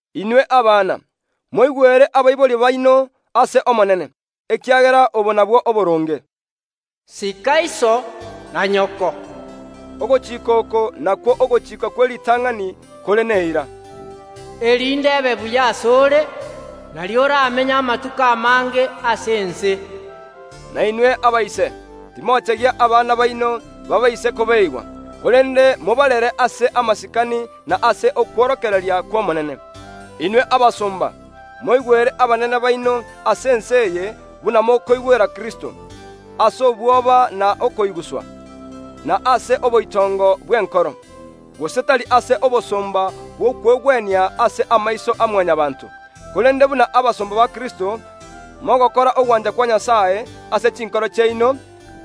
Inwe abana, moigwere abaibori baino ase Omonene, ekiagera obo nabwo oboronge. “Sika iso na nyoko” (ogochika oko nakwo ogochika kw’eritang’ani kore neira), “erinde ebe buya ase ore, nario oramenye amatuko amange ase ense.” Na inwe abaise, timochegia abana baino baabaise kobeeigwa, korende mobarere ase amasikani na ase okworokereria kw’Omonene. Inwe abasomba, moigwere abanene baino ase ense eye buna mokoigwera Kristo, ase obwoba na okoiguswa, na ase oboitongo bw’enkoro, gose tari ase obosomba bw’okwegwenia ase amaiso ya Mwanyabaanto, korende buna abasomba ba Kristo, mogokora ogwancha kwa Nyasae ase chinkoro chiaino;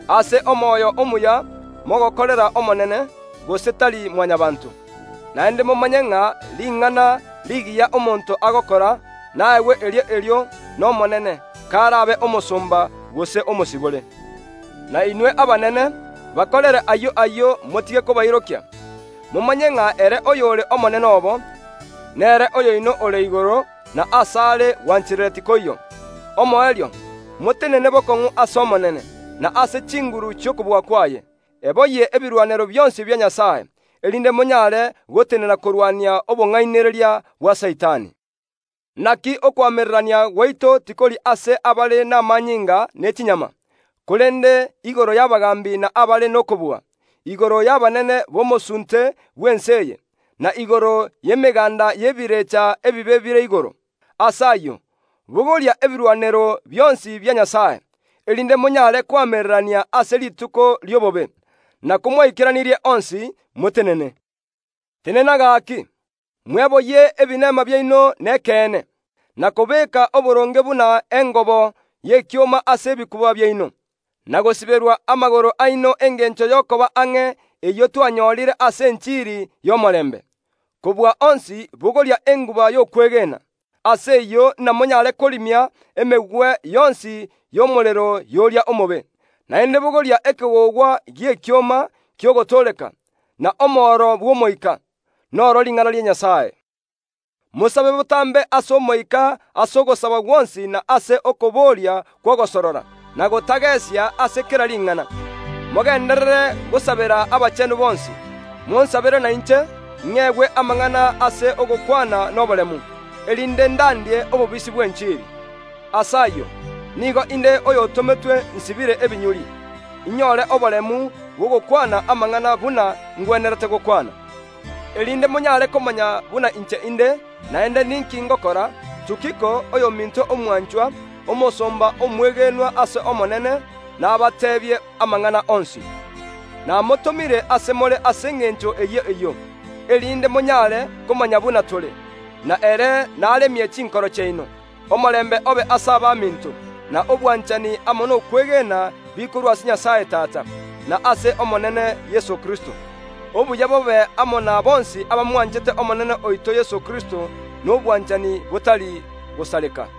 ase omoyo omuya mogokorera Omonene, gose tari Mwanyabaanto. Naende momanye ng’a ring’ana rigiya omonto agokora, naegwe erio erio n’Omonene, k’arabe omosomba, gose omosibore. Na inwe abanene, bakorere ayio ayio, motige kobairokia. Momanye ng’a ere oyore Omonene obo, nere oyoino ore igoro, na ase are gwanchereria tikoiyo. Omoerio, motenene bokong’u ase Omonene, na ase chinguru chi’okobua kwaye. Eboyie ebirwanero bionsi bia Nyasae, erinde monyaare gotenena korwania obong’ainereria bwa Saitani. Inaki okoamererania gwaito tikori ase abare n’amanyinga ne chinyama, korende igoro y’abagaambi na abare nokobua, igoro y’abanene b’omosuunte bw’ense eye, na igoro y’emegaanda y’ebirecha ebibe bire igoro. Ase ayio, bogoria ebirwanero bionsi bia Nyasae, erinde monyaare koamererania ase rituko ri’obobe, na komwaikeranirie onsi, motenene. Tenena gaaki, mweboyie ebinema biaino nekeene, na kobeeka oboronge buna engobo y’ekioma ase ebikuba biaino, na gosiberwa amagoro aino engencho y’okoba ang’e eyio twanyorire ase enchiri y’omorembe. Kobua onsi bogoria enguba y’okwegena, ase eyio namonyaare korimia emegwe yonsi y’omorero y’oria omobe. Naende bogoria ekegogwa gi’ekioma ki’ogotooreka, na omoro bw’Omoika, n’oro ring’ana ria Nyasae. Mosabe botambe ase Omoika ase ogosaba gwonsi na ase okoboria kw’ogosorora, na gotagesia ase kera ring’ana. Mogenderere gosabera abachenu bonsi. Monsabere nainche, ng’egwe amang’ana ase ogokwana n’oboremu, erinde ndandie obobisi bw’enchiri. Ase ayio, nigo inde oyo otometwe nsibire ebinyuri, inyore oboremu bw’ogokwana amang’ana buna ngwenerete gokwana. Erinde monyaare komanya buna inche inde, naende ninki ngokora, Tukiko, oyominto omwanchwa, omosomba omwegenwa ase Omonene, nabateebie amang’ana onsi. Namotomire ase more ase engencho eyio eyio, erinde monyaare komanya buna tore; na ere naremie chinkoro chiaino. Omorembe obe ase abaminto, na obwanchani amo nokwegena bikorwa ase Nyasae Tata, na ase Omonene Yeso Kristo. Obuya bobe amo na bonsi abamwanchete Omonene oito Yeso Kristo n’obwanchani botari gosareka.